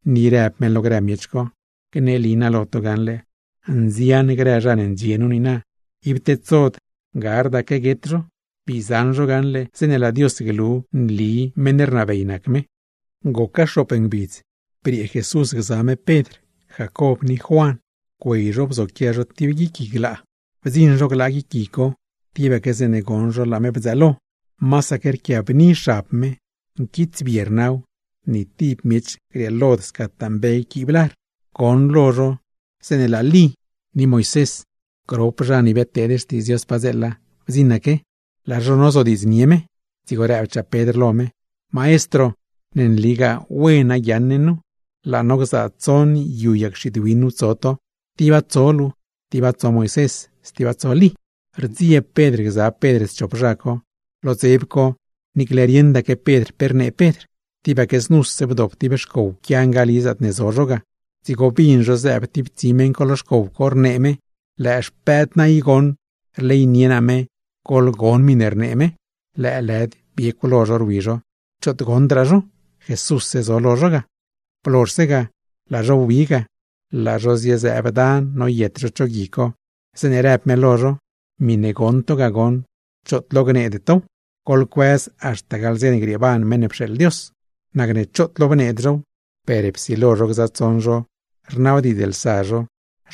Ni rëb me lo grë miech co: ―Gneli naa lo to gaṉle, nzian grë zha ne ndxie nu niina ib tedsod gardaque guet zho, bii zaṉ zho gaṉle zeeṉe laa Dios glu ne nli meṉ rnabey nac me. Goca xoop ngbidz, briee Jesús gza me Pedr, Jacob ni Juan, güey zho bzoquia zho tib guic gui glaa. Bdziṉ zho glaa guic gui co, tibaque zeeṉe goṉ zho laa me bdzëëlo. Masaque rquiabni xab me, nquitsbie rnaw; ni tib miech grieelod scataa mbe quiib lar. Goṉlo zho zeeṉe laa Lí ni Moisés (grop zha ne biadteed xtiidz Dios glo) bdziṉaque, laa zho nozodiidznie me. Dzigo rëbchaa Pedr lo me: ―Maestro, ¡ne nligaa wena guiaaṉ ne nu! Laa no gzaa tsoṉ yu yag xiid win nu tso to: tiba tso luu, tiba tso Moisés, stiba tso Lí. Rdzieb Pedr gza Pedr schop zha co, lo dzeb co niicle rieṉdaque Pedr pe rnee Pedr. Tibaque znuse bdop tib xcow pquia ngali zaatne zo zho ga; dzigo bin zho zëëb tib tsi meṉ co lo xcow co, rnee me: ―Lëë xpëëd naa i goṉ, rleynie naa me. Goḻgon miṉe rnee me. Lëëlëd biecw lo zho rwi zho, choot goṉdraa zho, Jesússe zo lo zho ga. Blozhse ga, laa zho wbique ga. Laa zho ziezëëb dan noyet zho cho gui co, zeeṉe rëb me lo zho: ―Miṉe goṉ to goṉ, choot lo gneede tow. Goḻcuëz haxta gaḻ dze ne grieeban Meṉ ne pxeeḻ Dios. Nacne choot lo bneed zhow, per psilo zho gza tsoṉ zho rnabdiidzlsa zho,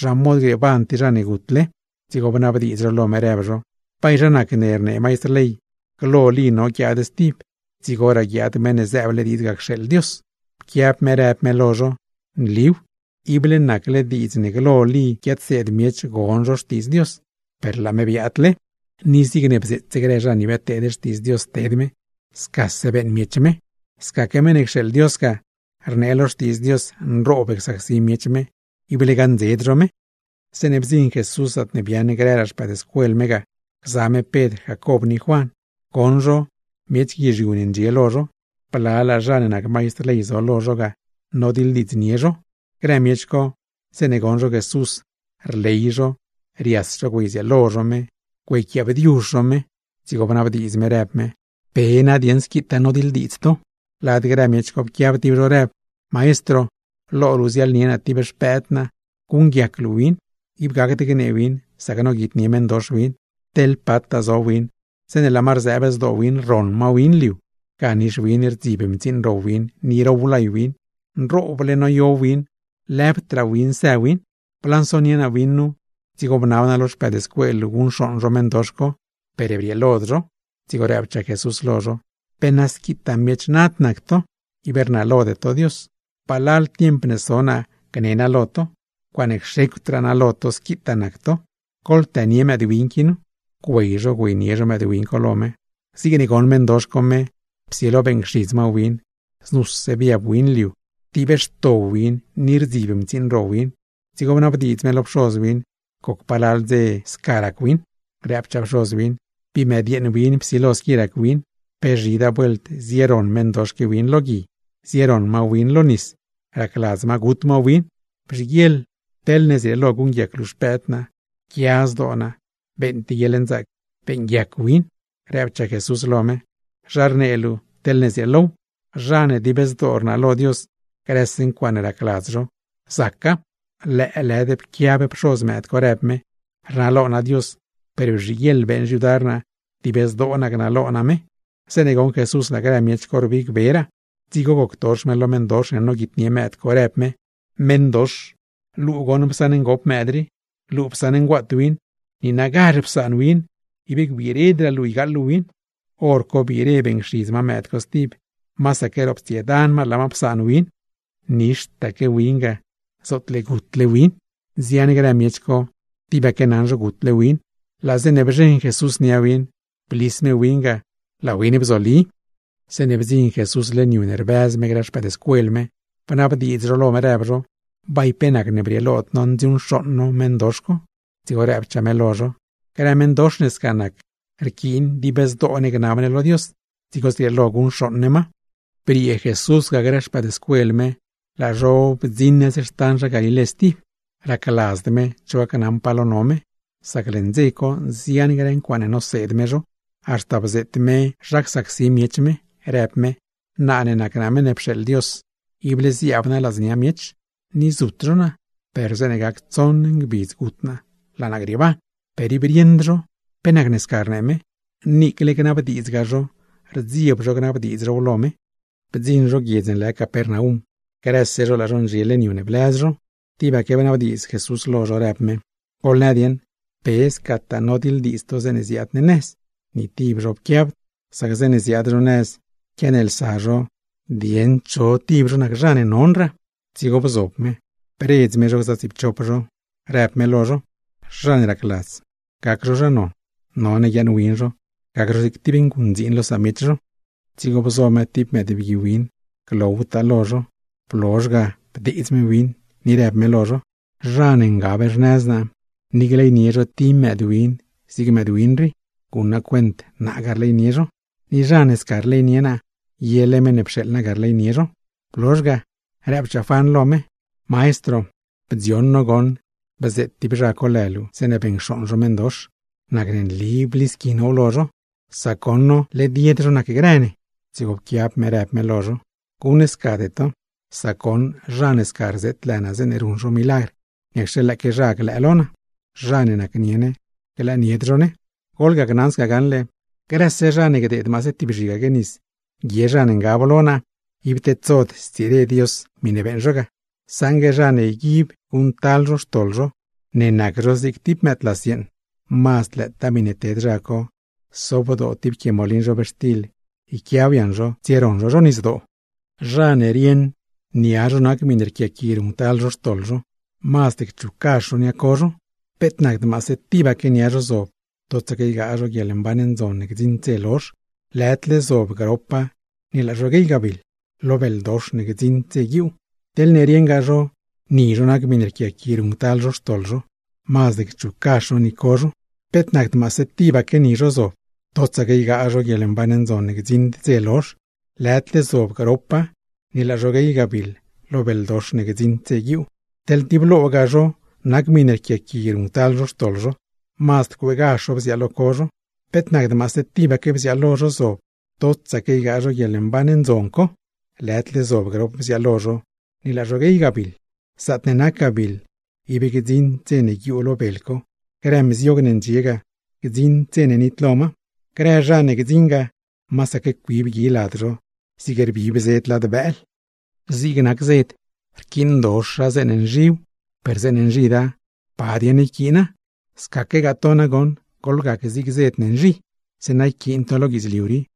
zha mod grieeban tib zha ne gutle. Dzigo bnabdiidz zho lo me, rëb zho: ―¿Bay zha nacne rnee maistr ley, glo Lí no guiaad stib, dzigoraa guiaad Meṉ ne zëëble diidz ga cxeeḻ Dios? Pquiab me rëb me lo zho: ―Nliw, ible nacle diidz ne glo Lí guiadseed miech gon zho xtiidz Dios, per laa me biaadle; ni zigne bzeetse grë zha ne biadteed xtiidz Dios ted me, scase beeṉ miech me. Scaque Meṉ ne cxeeḻ Dios ga, rnee lo Xtiidz Dios nroob csacsi miech me, ible gaṉdzed zho me. Zeeṉe bdziṉ Jesús zaatne biaaṉ grëraa xpëëdscuel me ga, gza me Pedr Jacob ni Juan; goṉ zho miech guizhiu ne ndxie lo zho; blalaa zha ne nac maistr ley zo lo zho ga, nodiḻdiidznie zho. Grë miech co, zeeṉe goṉ zho Jesús, rley zho, rias zho güeydzieelo zho me güeyquiaa bdiuzh zho me. Dzigo bnabdiidz me rëb me: ―¿Pe nadieṉ squitaa nodiḻdiidz to? Lad grë miech co pquiab tib zho, rëb: ―Maestro, lo luu ziaḻnie naa tib xpëëd naa guṉguiac luu win; ib gacd gnee win sac noguitnie meṉdox win. Teḻ pataa zo win, zeeṉe laa ma rzëëb zdoo win rroṉ ma win liu; ga nix win rdzib mtsiiṉ ro win, ni row lay win; nrooble noyo win lëbdraa win së win. Blansonie naa win nu, dzigo bnab naa lo xpëëdscuel luu guṉcxooṉ zho meṉdox co, per brieelod zho. Dzigo rëbchaa Jesús lo zho: ―¡Pe na squitaa miech nad nac to, ib rnalode to Dios! ¿Palal tiemp ne so naa gne naa lo to? ¡Ncuaaṉe cxecwdraa naa lo to squi nac to! ¡Goḻtënie mëëdwin qui nu! Güey zho güeynie zho mëëdwin co lo me. Zigne goṉ meṉdox co me, psilo beeṉcxidz ma win, znuse biab win liu, rtiibxto win ni rdzib mtsiiṉ ro win. Dzigo bnabdiidz me lo pxoz win, goc palal dze psilo sca rac win. Rëbchaa pxoz win: ―Bii mëdyeeṉ win psilo squi rac win. Pe zhidaa vuelt zieroṉ meṉdox qui win lo gui, zieroṉ ma win lo nis ne, racladz ma gut ma win. Bzhiguieḻ teḻne zrieelo guṉguiac luu xpëëd naa, ¡pquia zdoo naa, beeṉ tib guieḻnzaac beeṉguiac win! Rëbchaa Jesús lo me: ―¿Zha rnee luu “teḻne zrieelow”? ¡Zha ne dib zdoo rnalo Dios, grëse ncuaaṉe racladz zho, zaca! Lëëlëd pquiab pxoz mëëd co, rëb me: ―Rnalo naa Dios, per bzhiguieḻ beeṉ xyudar naa, ¡dib zdoo naa gnalo naa me! Zeeṉe goṉ Jesús laa grë miech co rbigberaa, dzigo goctox me lo meṉdox ne noguitnie mëëd co, rëb me: ―Meṉdox, luu goṉ psaṉ ngop mëëd rii, luu psaṉ nguaat win. ¡Niinagazh psaan win, ib gbiiredraa luu ygaaḻ luu win! Horco biire beeṉcxidz ma mëëd co stib, masaque roptsiedan ma laa psaan win, nixtaque win ga, zootle gutle win. Nzian grë miech co, tibaque naṉ zho gutle win. Laa zeeṉe bzheṉ Jesús nia win, blis me win ga, laa win bzoli. Zeeṉe bdziṉ Jesús leṉ yu ne rbëz me grë xpëëdscuel me, bnabdiidz zho lo me rëb zho: ―¿Bay pe nacne brieelod no ndziuṉcxooṉ no meṉdox co? Dzigo rëbchaa me lo zho: ―Grë meṉdox ne sca nac, rquiin dib zdoo ne gnab ne lo Dios dzigo zrieelo guṉcxooṉ ne ma. Briee Jesús ga grë xpëëdscuel me, laa zho wbire nëz xtan Galilé stib. Racladzd me cho gacnaṉ pa lo no me; sac leṉ dze co nzian grë ncuaaṉe noseed me zho. Haxta bzeet me zha csacsi miech me, rëb me: ―Naa ne nac naa Meṉ ne pxeeḻ Dios, ible ziaab naa ladznia miech, ni zut zho naa. Per zeeṉe gac tsoṉ ngbidz gut naa, laa naa grieeban. Per ib rieṉd zho pe nacne sca rnee me, niicle gnabdiidzgaa zho rdzieb zho gnabdiidz zhow lo me. Bdziṉ zho guiedz ne lë Capernaum; grëse zho laa zho ndxie leṉ yu ne blëz zho, tibaque bnabdiidz Jesús lo zho, rëb me: ―Goḻnë dieṉ, ¿pe scataa nodiḻdiidz to zeeṉe ziaad ne nëz? Ni tib zho ib pquiabd, sac zeeṉe ziaad zho nëz quianeelsa zho dieṉ cho nac zha ne nonraa. Dzigo bzob me, bredz me zho gza tsiipchop zho rëb me lo zho: ―Zha ne racladz gac zho zha non, none guiaaṉwin zho gac zho zig tib nguṉdziin lo samiech zho. Dzigo bzo me tib mëëdbgui win glowtaa lo zho; blozh ga bdeedz me win ni rëb me lo zho: ―Zha ne ngab xnëz naa, ni gleynie zho tib mëëdwin zig mëëdwin rii, guṉ naa cuent naa ga rleynie zho; ni zha ne sca rleynie naa, yele meṉ ne pxeeḻ naa ga rleynie zho. Blozh ga, rëbchaa Juan lo me: ―Maestro, bdzioṉ no goṉ bzeet tib zha co lë luu zeeṉe beṉcxooṉ zho meṉdox; nacne nli blisqui now lo zho, sac goṉ, led yed zho nacgrë ne. Dzigo pquiab me rëb me lo zho: ―¡Guṉscade to! Sac goṉ zha ne sca rzeet lë naa zeeṉe ruṉ zho milagr, niacxe lëëque zha glëë lo naa. Zha ne nacnie ne, glëëd zho lo ne. ’Goḻgacnaṉ sca gaṉle, grëse zha ne gdeed maase tib zhigaque nis guie zha ne ngab lo naa, ib tedsod stsire Dios miṉe beeṉ zho ga. Saṉgue zha ne yguib guṉctal zho xtoḻ zho ne nac zho zig tib mëëdlas yeeṉ; mazd lëëtaa miṉe ted zha co sobdoo tib quie molin zhobxtil yquiaw yaṉ zho tsieroṉ zho zho nisdoo. ’Zha ne rieṉ nia zho nac miṉe rquiaqui ruṉctal zho xtoḻ zho, mazd cchuggazh zho nia co zho. Peet nacd maase tibaque nia zho zob totsaque ygaa zho guieḻmban ndzon ne gdziṉd dze lozh, lëdle zob gropa ni laa zho guey gabiḻ, lo beldox ne gdziṉd dze guiuu. Teḻne rieṉgaa zho ni zho nac miṉe rquiaqui ruṉctal zho xtoḻ zho, mazd cchuggazh zho ni co zho. Peet nacd maase tibaque ni zho zob totsaque ygaa zho guieḻmban ndzon ne gdziṉd dze lozh, lëdle zob gropa ni laa zho guey gabiḻ, lo beldox ne gdziṉd dze guiuu. Teḻ tib logaa zho nac miṉe rquiaqui ruṉctal zho xtoḻ zho, mazd cueegazh zho bziaalo co zho. Peet nacd maase tibaque bziaalo zho zob totsaque ygaa zho guieḻmban ndzon co, lëdle zob grop bziaalo zho ni laa zho guey gabiḻ. Zaatne nac gabiḻ, ib gdziṉd dze ne guiuu lo bel co; grë mziog ne ndxie ga, gdziṉd dze ne nitlo ma. Grëse zha ne gdziṉ ga, masaque cuib gui lad zho zig rbib zed lad bëël. ’Zig nac zed, rquiindoxa zeeṉe nzhiw, per zeeṉe nzhida, ¿pa dieṉ yquiina? Scaquegaa to nagoṉ goḻgac zig zed ne nzhi, zeeṉa yquiin to lo guidzliu rii;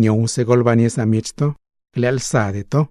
niowse goḻbannie samiech to, glëëlsade to.